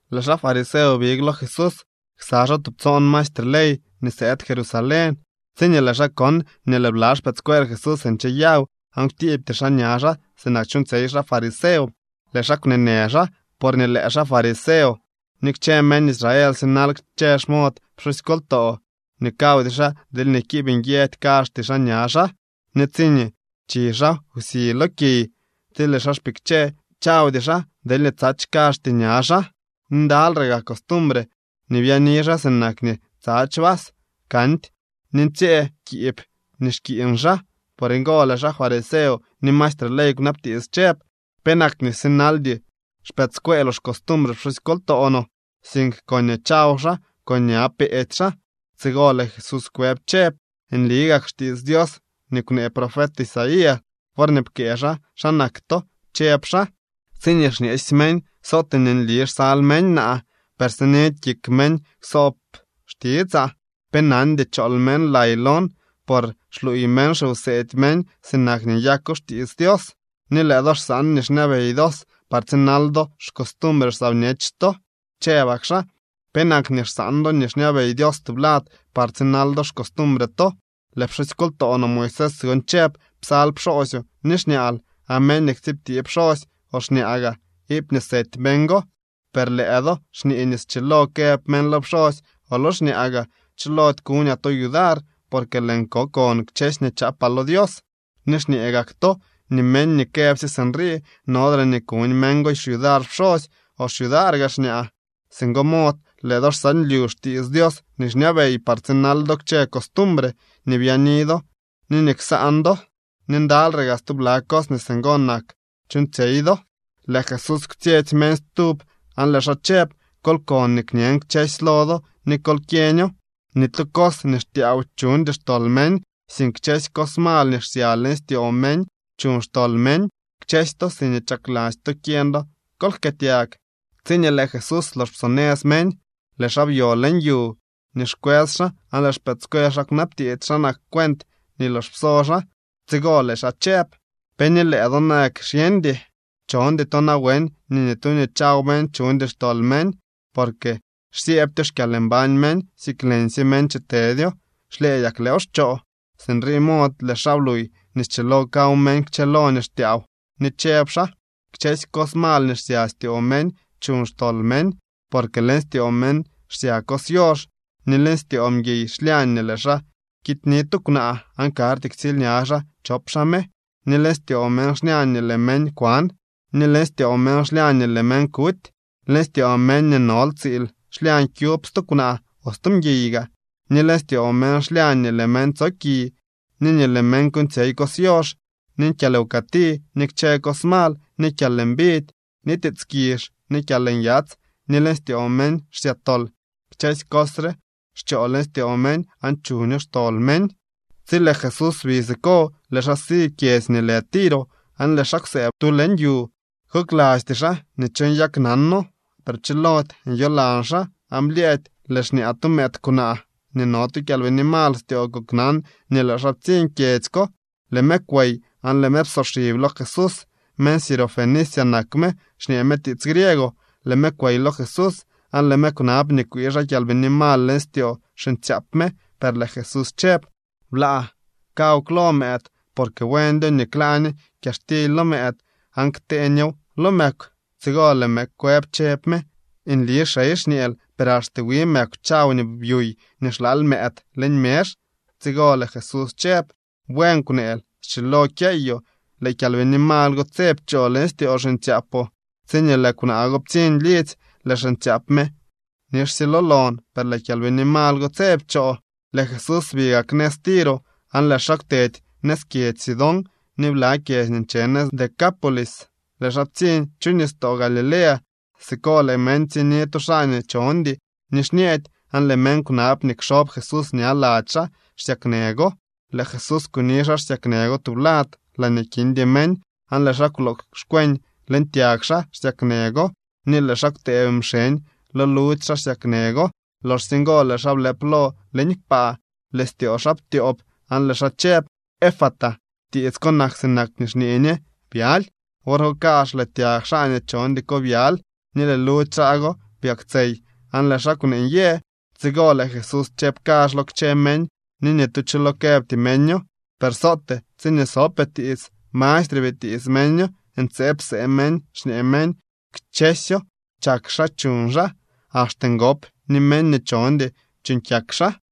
Lëë xaa fariseo big lo Jesús ksa xaa tubtsoon maestre ley nii sëëd Jerusalén. Tsiñee lëë xaa kon nii lëë bla xpëëdscuel Jesús ncheyaw aan kwtiibty xaa ña xaa sinak chuuñtsyey xaa fariseo, lëë xaa kwneenë xaa. Porñee lëë xaa fariseo ni kchë meñ Israel sinal kchë xmod pxusykoltoo nii kawdy xaa deelñee kiib nyë kazhty xaa ña xaa. Ni tsiñee chi xaa wsi lo kiy, tsi lëë xaa xpikche, chawdy xaa deelñee tsadx kazhty ña xaa. Ni ndalyre gaa costumbre nii byaani xaa sinak nii tsadx vas, kandy ni ntsyëë kiib nii xkiiñ xaa. Por ngo lëë xaa fariseo ni maestre ley kwnabtiits chëb: —¿Penak nii sinaldy xpëëdscueeloo xcostumbre pxusykoltoo no, sink koñee chaw xaa con ña peedy xaa? Tsigo lëë Jesús kwëb chëb: —Nli gak xtiits Dios nii kwnee profet Isaías worñee pkëë xaa xa nak to. Chëb xaa: Tsiñee xñeesy meñ, sootee nii nli xsal meñ naa, per sinidy kik meñ ksoob xtitsaa. Pe nandy chool meñ lay lon, por xluuy meñ xiwseedy meñ sinak nii nyako xtiits Dios. Ni lëë do xsaan nii xñabey Dios par tsinal do xcostumbre saa bñech to. Chëbak xaa: —¿Penak nii xsaan do nii xñabey Dios tublad par tsinal do xcostumbre to? Lëë pxusykoltoo no Moisés gon chëb: “Psal pxoosyoo ni xñaal”, aan “Meñ nii ktsiibtee pxosy o xñaa gaa iipñee sety meñ go.” Per lëë do xñee nii schilo këb meñ lo pxosy o lo xñaa gaa: “Chilody kuñaa to yudar porque lëën ko kon kchësy nii chaapaa lo Dios.” Ni xñee gak to nii meñ nii këbsye sinrii, nodre ni kuñ meñ go xyudar pxosy o xyudaar gaa xñaa. Singo mod lëë do xsaanlyu xtiits Dios nii xñabey par tsinal do kchë costumbre nii byaani do ni nii ksaan do. Ni ndalyre gaa stubla cos nii singo nak chuuñtsyey do. Lëë Jesús kwtsyetsy meñ stub aan lëë xaa chëb: —Kol kon nii kñen kchësy lo do ni kol kyeño: Ni tu cos nii xtyaaw chuñdy xtol meñ. Sink kchë cos mal nii xsya leñ styoo meñ chuñ xtol meñ. Kchësy to siñee chakladzy to kyeñ do, kol jkëëtyag. Tsiñee lëë Jesús lox psonëz meñ, lëë xaa byo leñ yu nii xkwës xaa aan lëë xpëëdscuel xaa kwnabtiits xa nak cuent nii lox pso xaa. Tsigo lëë xaa chëb: —¿Pe ni lëë do nayak xyeñdy? ¿Chondy to nawen nii ni tu nii chaw meñ chuñdy xtol meñ por xsyëëbtyo xkyalmbañ meñ, sink leñsye meñ chitedyo, xlyëëdyak lëëw xchoo? Sinrii mod lëë xaa bluuy nii schilo kaw meñ kchëlo nii xtyaaw. Ni chëb xaa: —Kchë cos mal nii xsya styoo meñ chuñ xtol meñ. Porque leñ styoo meñ xsya cos yox, ni leñ styoo mguiy xlyañ nii lëë xaa kityni tu kwnaa aan karty ktsiilña xaa chop xaa me, ni leñ styoo meñ xlyañ nii lëë meñ kwan, ni leñ styoo meñ xlyañ nii lëë meñ kuty. Leñ styoo meñ nii nol tsiil xlyañ kyub stu kwnaa o stu mguiy gaa, ni leñ styoo meñ xlyañ nii lëë meñ tsoki, ni nii lëë meñ kuuñtsyey cos yox, ni kyalwkëti, ni kchë cos mal, ni kyalmbidy, ni tiits kizh, ni kyalnyats, ni leñ styoo meñ xsya tol. Kchësy cos re xchoo leñ styoo meñ aan chuño xtol meñ. Tsi lëë Jesús bi siko, lëë xaa si kyedzy nii lë Tiro aan lëë xaa kwsëëb tu leñ yu. Koklasty xaa nii cho nyaknano, per pchilody nyolan xaa. Aan blyëëdy lëë xñaa tu mëëd kwnaa nii no tu kyalbini mal styoo koknan nii lëë xaa ptsiñ kyedzy ko. Lëë me kwey aan lëë me psoxib lo Jesús. Meñ Sirofenicia nak me, xñee me tiits griego. Lëë me kwey lo Jesús aan lëë me kwnab nii kwii xaa kyalbini mal leñ styoo xiñtsyaap me. Per lëë Jesús chëb: —Blaa kaw klo mëëd porque buendyo nii kla ñe kyaxtily lo mëëd aan ktee ñew lo mëkw. Tsigo lëë me kwëb chëb me: —Nli, xey, xñeel, per axte wi mëkw chaw nii byuy nii xlaal mëëd leñ mezh. Tsigo lëë Jesús chëb: —Buen kwneel. Schilo kyeyoo. Lëë kyalbini mal go tse pchoo leñ styoo xiñtsyaapoo. Tsiñee lëë kwnaa go ptsiñ lidzy, lëë xiñtsyaap me nixsye lo lon, per lëë kyalbini mal go tse pchoo. Lëë Jesús bi gak nëz Tiro aan lëë xaa kwtedy nëz kyedzy Sidón ni bla kyedzy nii nche nëz Decápolis. Lëë xaa ptsiñ chu nistoo Galilea. Siko lëë meñ ptsiñni tu xaa nii chondy ni xñeedy aan lëë meñ kwnab nii kxob Jesús ña lady xaa xsyaknë go. Lëë Jesús kuni xaa xsyaknë go tublad laañee kindy meñ, aan lëë xaa kwloo xkweñ leñ tyag xaa xsyaknë go ni lëë xaa kwtëëb mxeñ lo ludzy xaa xsyaknë go. Loxsye ngo lëë xaa blëp lo leñ kpaa, lëë styoo xaa ptyoob aan lëë xaa chëb: —¡Efata! (Tiits ko nak sinak nii xñee ñe: ¡Byaly!) Wor go kazh lëë tyag xaa nii chondy ko byaly, ni lëë ludzy xaa go byaktsey aan lëë xaa kwnee nyë. Tsigo lëë Jesús chëb kazh lo kchë meñ, nii ni tu cho lo këbty meño. Per sootee tsiñee sopee tiits, mastre bitiits meño. Ntseeb psee meñ xñee meñ: —Kchësyo chak xaa chuñ xaa. Axte ngop ni meñ nii chondy chuuñ kyak xaa.